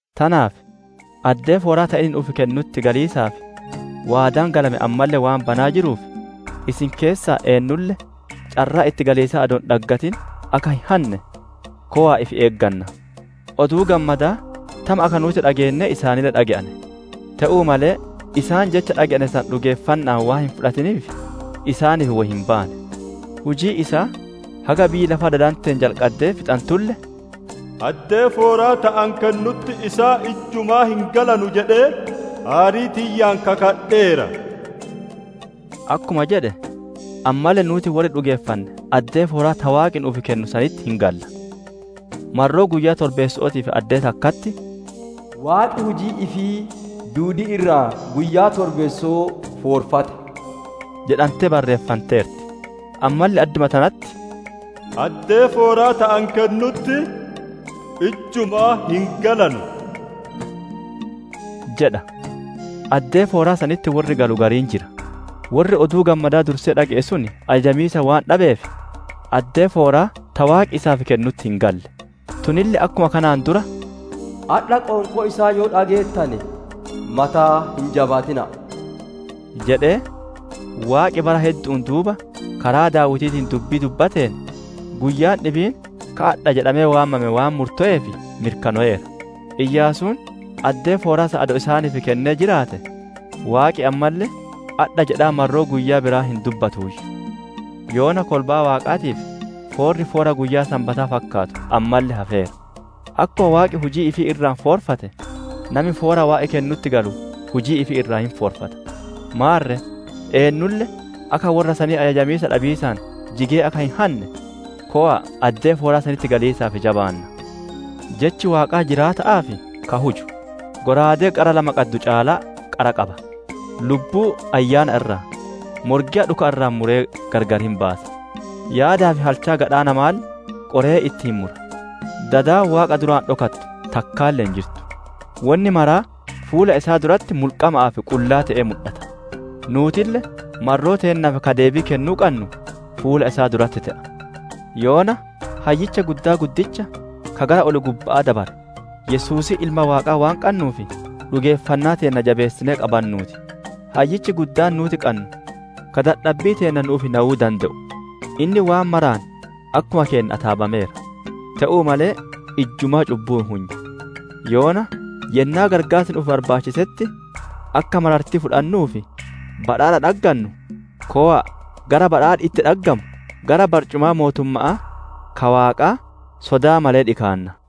Tanaaf addee fooraa ta inni nu'uuf kennutti galiisaaf waadaan galame ammalle waan banaa jiruuf, isin keessaa eennulle carraa itti galiisaa adoo hin dhaggatin akka hin hanne, kowa'a ifi eeggannaa! Oduu Gammadaa tama akka nuuti dhageennee isaanille dhage'ane; te'uu malee isaan jecha dhage'ane san dhugeeffanna'aan waan hin fudhatiniif isaaniif wo hin baane. Hujiin isaa haga biyyi lafaa dadanteen jalqaddee fixantulle, «Addee fooraa ta ani kennutti isaan ijjumaa hin galanu jedhee aarii tiyyaan kakadheera» akkuma jedhe, ammalle nuuti worri dhugeeffanne addee fooraa ta waaqi nu'uuf kennu sanitti hin galla. Marroo guyyaa torbeesso'ootiif addee takkatti, «Waaqi hujii ifii duudii irraa guyyaa torbeesso'oo foorfate» jedhantee barreeffanteerti. Ammalle adduma tanatti, «Addee fooraa ta ani kennutti ijjumaa hin galanu» jedha. Addee fooraa sanitti worri galu gariin jira; worri Oduu Gammadaa dursee dhage'e sun ajajamiisa waan dhabeef addee fooraa ta Waaqi isaaf kennutti hin galle. Tunille akkuma kanaan dura, «Adha qoonqoo isaa yoo dhageettane; mataa hin jabaatina'a» jedhee, Waaqi bara heddu'uun duuba karaa Daawitiitiin dubbii dubbateen, guyyaan dhibiin ka, «Adha» jedhamee waamame waan murtoweef mirkanoweera. Iyaasuun addee fooraa san adoo isaaniif kennee jiraate, Waaqi ammalle, «Adha» jedhaa marroo guyyaa biraa hin dubbatuuyyu. Yoona kolbaa Waaqaatiif foorri foora guyyaa Sanbataa fakkaatu ammalle hafeera. Akkuma Waaqi hujii ifii irraa foorfate, nami foora Waaqi kennutti galu huji ifii irraa hin foorfata. Maarre eennulle akka worra sanii ajajamiisa dhabiisaan jigee akka hin hanne, kowa'a addee fooraa sanitti galiisaaf jabaannaa! Jechi Waaqaa jiraata'aa fi ka huju; shallaagaa qara lama qabu caalaa qara qaba; lubbuu ayyaana irraa, morgeya dhuka irraa muree gargar hin baasa; yaadaa fi halchaa gadhaa namaalle qoree itti hin mura. Dadi Waaqa duraa dhokattu takkaalle hin jirtu; wonni maraa fuula isaa duratti mulqama'aa fi qullaa te'ee mudhata; nuutille marroo teennaaf ka deebii kennuu qannu fuula isaa duratti te'a. Yoona Hayyicha Guddaa guddicha ka gara ol-gubba'aa dabare, Yesuusii Ilma Waaqaa waan qannuuf dhugeeffannaa teenna jabeessinee qabannuu ti. Hayyichi Guddaan nuuti qannu ka dadhabbii teenna nu'uuf nayuu dande'u; inni waan maraan akkuma keenna ataabameera; te'uu malee ijjumaa cubbuu hin hunye. Yoona yennaa qarqaarsi nu'uuf barbaachisetti akka marartii fudhannuu fi badhaadha dhaggannu, kowaa gara badhaadhi itti dhaggamu, gara barcumaa mootumma'aa ka Waaqaa sodaa malee dhikaannaa.